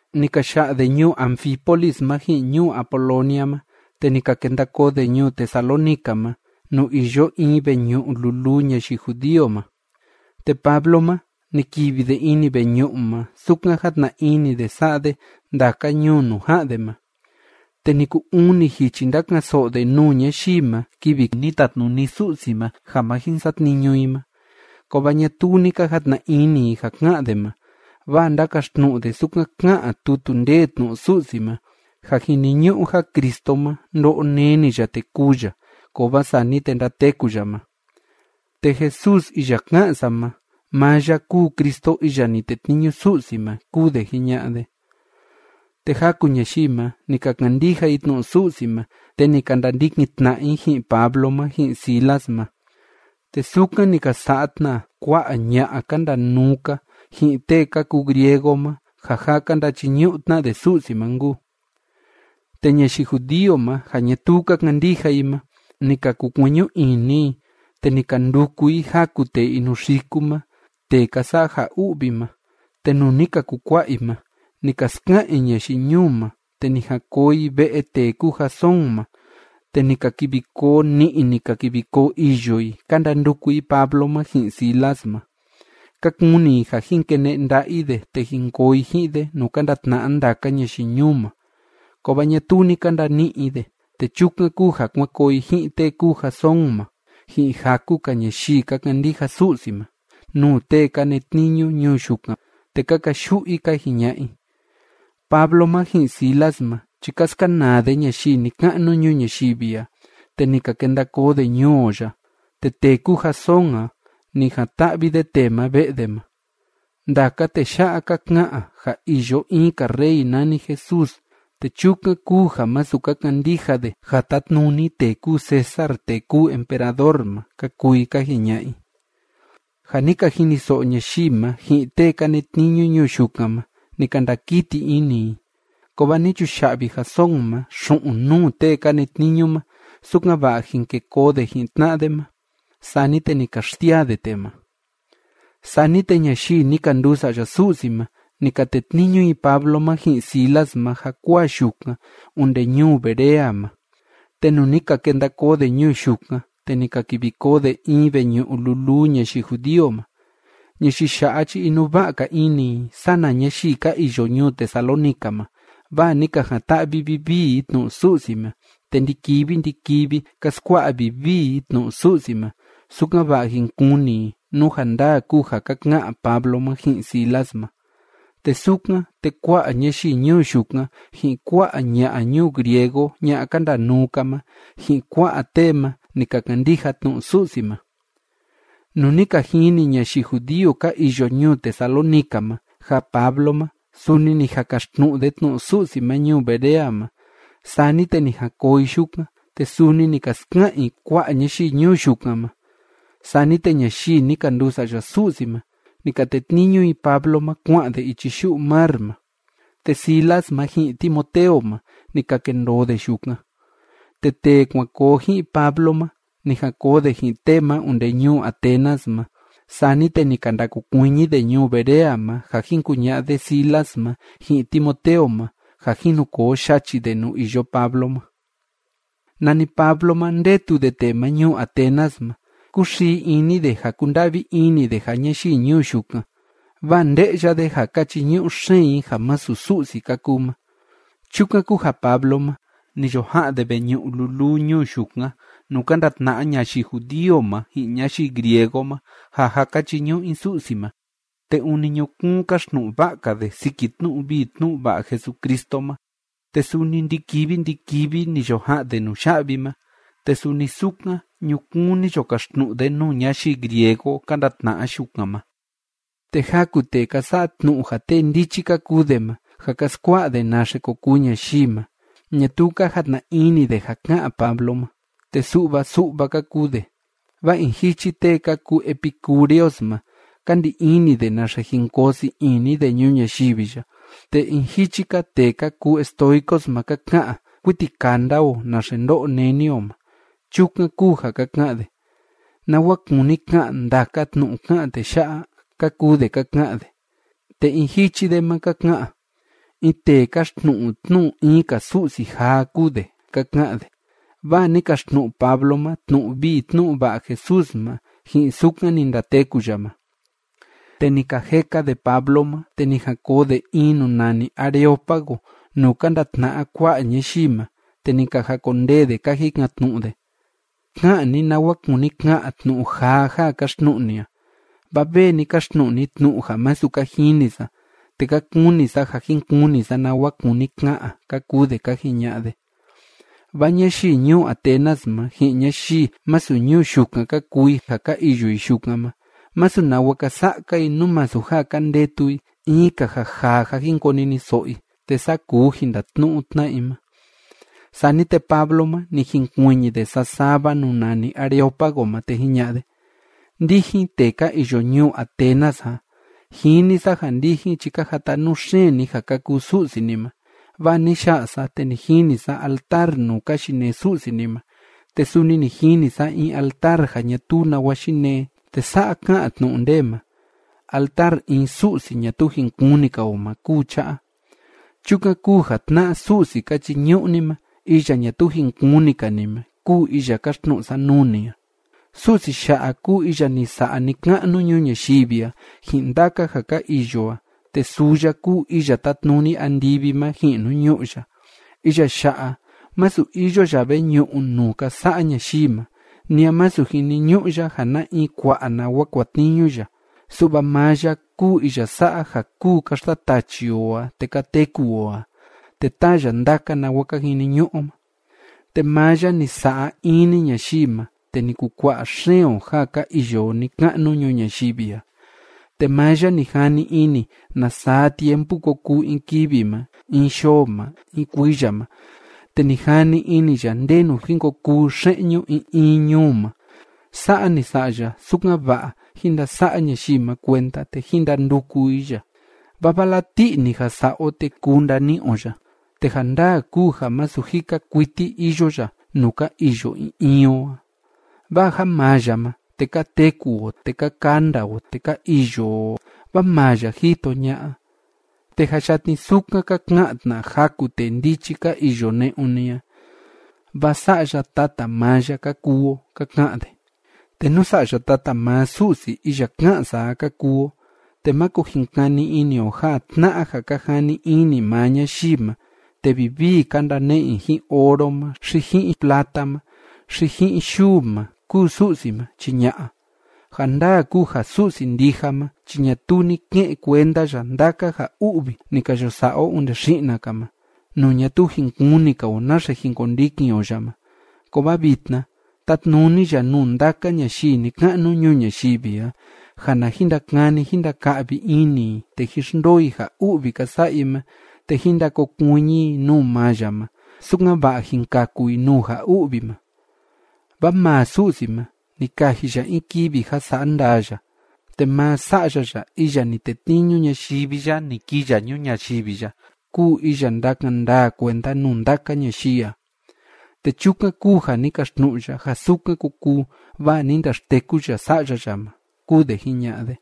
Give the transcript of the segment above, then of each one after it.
Ni ka ya'a de ñuu Anfípolis ma ji'in ñuu Apolonia ma, te ni ka kenda koo de ñuu Tesalónica ma, nuu iyo in veñu'u luluu ñayii judío ma. Te Pablo ma, ni kivi de ini veñu'u ma, sukan játna ini de sa'a de ndaka ñuu nuu ja'an de ma. Te ni kuu uni jichi ndaka'an‑so'o de nuu ñayii ma kivi ni tatnuni Su'si ma ja ma jin satniñu i ma, kovaa ñatuu ni ka jatna ini i ja ká'an de ma, vaa ndákaxtnu'u de sukan ká'an tutu ndee tnu'u Su'si ma, ja jiniñu'u ja Cristo ma ndo'o neni ya te kûu ya, kovaa sani te ndateku ya ma: ―Te Jesús iya ká'an sa ma, maa ya kúu Cristo iya ni tetniñu Su'si ma ―kúu de jiña'a de. Te jaku ñayii ma, ni ka kandija i tnu'u Su'si ma, te ni ka ndandikin tna'a i ji'in Pablo ma ji'in Silas ma. Te sukan ni ka sa'a tna kua'a ña'a ka ndanuu‑ka, ji'in tee ka kuu griego ma ja jâ ka ndachiñu'u tna de Su'si ma nkuu. Te ñayii judío ma ja ñatuu ka kandija i ma, ni ka kukueñu ini i, te ni ka nduku i jaku tee inukuxi ma tee ka sa'a ja u'vi ma, te nuu ni ka kukua'a i ma, ni ka ska'an i ñayii ñuu ma, te ni jan koo i ve'e tee kúu Jasón ma, te ni ka kivi koo ni'i, ni ka kivi koo îyo i, ka ndanduku i Pablo ma ji'in Silas ma. Ka kuni i ja jin kene'e nda'a i de te jin koo i ji'in de nuu ka ndatna'a ndaka ñayii ñuu ma. Kovaa ñatuu ni ka ndani'i i de, te chukan kúu ja kuan koo i ji'in tee kúu Jasón ma, ji'in jaku‑ka ñayii ka kandija Su'si ma, nuu tee ka netniñu ñuu yukan, te ka kayu'u i, ka jiña'a i: ―Pablo ma ji'in Silas ma chi ka skanaa de ñayii ni‑ka'nu ñuu ñayivi a, te ni ka kenda koo de ñuu o ya. Te tee kúu Jasón a, ni jan‑ta'vi de tee ma ve'e de ma. Ndaka tee ya'a ka ka'an ja iyo in‑ka rey nani Jesús, te chukan kúu ja masu ka kandija de ja tátnuni tee kúu César tee kúu emperador ma ―ka kuu i ka jiña'a i. Ja ni ka jiniso'o ñayii ma, ji'in tee ka netniñu ñuu yukan ma, ni ka ndakiti ini i. Kovaa ni chuya'vi Jasón ma xu'un nuu tee ka netniñu ma, sukan‑va'a jin ke koo de ji'in tna'a de ma, sani te ni ka xsiaa de tee ma. Sani te ñayii ni ka nduu sa'ya Su'si ma, ni ka tetniñu i Pablo ma ji'in Silas ma jakuaa yukan onde ñuu Berea ma. Te nuu ni ka kenda koo de ñuu yukan, te ni ka kivi koo de in veñu'u luluu ñayii judío ma. Ñayii ya'a chi inuva'a‑ka ini i sana ñayii ka iyo ñuu Tesalónica ma, vaa ni ka jan‑ta'vi vivii i tnu'u Su'si ma, te ndi‑kivi ndi‑kivi ka skua'a vivii i tnu'u Su'si ma, sukan‑va'a jin kuni i nú ja ndaa kúu ja ka ka'an Pablo ma ji'in Silas ma. Te sukan, te kua'a ñayii ñuu yukan, ji'in kua'a ña'a ñuu griego ña'a ka ndanuu‑ka ma, ji'in kua'a tee ma, ni ka kandija tnu'u Su'si ma. Nuu ni ka jini ñayii judío ka iyo ñuu Tesalónica ma ja Pablo ma, suni ni jan kaxtnu'u de tnu'u Su'si ma ñuu Berea ma, sani te ni jan koo i yukan, te suni ni ka ska'an i kua'a ñayii ñuu yukan ma. Sani te ñayii ni ka nduu sa'ya Su'si ma, ni ka tetniñu i Pablo ma kua'an de ichi yu'u mar ma. Te Silas ma ji'in Timoteo ma, ni ka kendoo de yukan. Te tee kuan koo ji'in Pablo ma, ni jan koo de ji'in tee ma onde ñuu Atenas ma, sani te ni ka ndakokuiñi de ñuu Berea ma ja jin kuña'a de Silas ma ji'in Timoteo ma ja jin nu koo yachi de nuu iyo Pablo ma. Nani Pablo ma, ndetu de tee ma ñuu Atenas ma, kúxii ini de ja kúnda'vi ini de ja ñayii ñuu yukan, vaa nde'ya de ja ka chiñu'u xeen i ja masu Su'si ka kuu ma. Chukan kúu ja Pablo ma, ni yo ja'an de veñu'u luluu ñuu yukan, nuu ka ndatna'a ñayii judío ma ji'in ñayii griego ma ja jâ ka chiñu'u i Su'si ma, te ûni ñukuun káxtnu'u va'a‑ka de siki tnu'u vii tnu'u va'a Jesucristo ma. Te suni ndi‑kivi ndi‑kivi ni yo ja'an de nuya'vi ma, te suni sukan ñukuun ni yo kaxtnu'u tna de nuu ñayii griego ka ndatna'a yukan ma. Te jaku tee ka sa'a tnu'u ja tee ndichi ka kuu de ma, ja ka skua'a de naxe ko kuu ñayii ma, ñatuu ka jatna ini de ja ká'an Pablo ma, te su'va su'va ka kuu de, vaa in jichi tee ka kuu epicúreos ma, ka ndi ini de naxe jin koo sii ini de ñuu ñayivi ya, te in jichi‑ka tee ka kuu estoicos ma ka ka'an kuiti kanda o naxe ndo'o neni o ma. Chukan kúu ja ka ka'an de: ―¿Nawa kúni ka'an ndaka tnu'u ká'an tee ya'a? ―ka kuu de ka ka'an de. Te in jichi de ma ka ka'an: ―In tee káxtnu'u tnu'u in‑ka su'si jaa kúu de ―ka ka'an de. Vaa ni kaxtnu'u Pablo ma tnu'u vii tnu'u va'a Jesús ma, ji'in sukan ni ndateku ya ma. Te ni ka jeka de Pablo ma, te ni jan koo de in nuu nani Areópago nuu ka ndatna'a kua'a ñayii ma, te ni ka jakondee de ka jikan‑tnu'u de: ―Ka'an ni nawa kúni ka'an tnu'u jaa ja káxtnu'u ni a. Vaa vee ni kaxtnu'u ni tnu'u ja masu ka jini sa, te ka kuni sa ja jin kuni sa nawa kúni ka'an ―ka kuu de ka jiña'a de. Vaa ñayii ñuu Atenas ma, ji'in ñayii masu ñuu yukan ka kuu i ja ka iyo i yukan ma, masu nawa ka sa'a‑ka i, nú masu ja ka ndetu i in‑ka ja jaa ja jin koniniso'o i, te saa kuu jin ndatnu'u tna'a i ma. Sani te Pablo ma, ni jinkuiñi de sasava nuu nani Areópago ma, te jiña'a de: ―Ndijin tee ka iyo ñuu Atenas a, jini sa ja ndijin chi ka jatanuu xeen ni ja ka kuu su'si ni ma. Vaa ni ya'a sa, te ni jini sa altar nuu ka yinee su'si ni ma, te suni ni jini sa in altar ja ñatuu nawa yinee, te sa'a ká'an tnu'u ndee ma: “Altar in su'si ñatuu jin kuni‑ka o ma kúu cha'a.” Chukan kúu ja tna'a Su'si ka chiñu'u ni ma iya ñatuu jin kuni‑ka ni ma, kúu iya káxtnu'u sa nuu ni a. ’Su'si ya'a kúu iya ni sa'a ni‑ka'nu ñuu ñayivi a ji'in ndaka ja ka iyo a, te suu ya kúu iya tátnuni andivi ma ji'in nuu ñu'ú ya. Iya ya'a, masu iyo ya veñu'u nuu ka sa'a ñayii ma. Ni a masu jiniñu'u ya ja na in kua'a nawa kuatniñu ya, su'va maa ya kúu iya sa'a ja kúu ka xtatachi o a te ka teku o a, te táa ya ndaka nawa ka jiniñu'u o ma. Te maa ya ni sa'a in‑ni ñayii ma, te ni kukua'a xeen o ja ka iyo o ni‑ka'nu ñuu ñayivi a. Te maa ya ni jani ini na saa tiempu ko kuu in kivi ma in yoo ma in kuiya ma, te ni jani ini ya ndenu jin ko kuu xe'ñu in in ñuu ma. Sa'a ni sa'a ya, sukan‑va'a jín ndasa'a ñayii ma kuenda te jín ndanduku i ya. Vaa vala ti'i‑ni ja sa'a o, te kuu ndani'i o ya. Te ja ndaa kúu ja masu jika kuiti iyo ya nuu ka iyo in in o a. Vaa ja maa ya ma, te ka teku o te ka kanda o te ka iyo o, vaa maa ya jito ña'a, te jâ yatni sukan ka ka'an tna jaku tee ndichi ka iyo ne'un ni a: “Vaa sa'ya tata maa ya ka kuu o”, ka ka'an de. ’Te nú sa'ya tata maa Su'si iya ká'an sa a ka kuu o, te máko jin kani ini o ja tna'a ja ka jani ini maa ñayii ma te vivii ka ndane'e i ji'in oro ma, xi ji'in plata ma, xi ji'in yuu ma, kúu Su'si ma, chi ña'a. Ja ndaa kúu ja Su'si ndija ma chi ñatuu ni ke'en kuenda ya ndaka ja u'vi ni ka yo sa'a o onde xi'na‑ka ma, nuu ñatuu jin kuni‑ka o naxe jin kondikin o ya ma, kovaa vitna tátnuni ya nuu ndaka ñayii ni‑ka'nu ñuu ñayivi a ja na jin ndakani jín ndaka'vi ini i te jín xndoo i ja u'vi ka sa'a i ma te jín ndakokuiñi i nuu maa ya ma, sukan‑va'a jin kaku i nuu ja u'vi ma. Vaa maa Su'si ma, ni kaji ya in kivi ja sa'a ndaa ya, te maa Sa'ya ya iya ni tetniñu ñayivi ya ni kii ya ñuu ñayivi ya kúu iya ndakan ndaa kuenda nuu ndaka ñayii a. Te chukan kúu ja ni kaxtnu'u ya ja sukan ko kuu, vaa ni ndaxteku ya Sa'ya ya ma ―kúu de jiña'a de.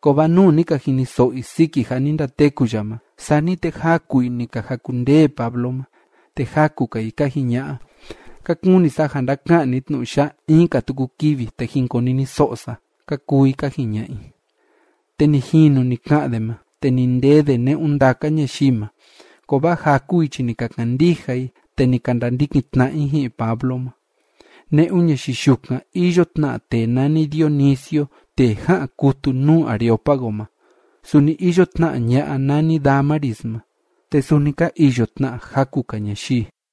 Kovaa nuu ni ka jiniso'o i siki ja ni ndateku ya ma, sani te jaku i ni ka jakundee Pablo ma, te jaku‑ka i ka jiña'a: ―Ka kuni sa ja ndaka'an ni tnu'u ya'a in‑ka tuku kivi, te jin koniniso'o sa ―ka kuu i ka jiña'a i. Te ni jinu ni ka'an de ma, te ni ndee de ne'un ndaka ñayii ma. Kovaa jaku i chi ni ka kandija i, te ni ka ndandikin tna'a i ji'in Pablo ma. Ne'un ñayii yukan iyo tna tee nani Dionisio tee ja'an kutu nuu Areópago ma. Suni iyo tna ña'a nani Dámaris ma. Te suni ka iyo tna jaku‑ka ñayii.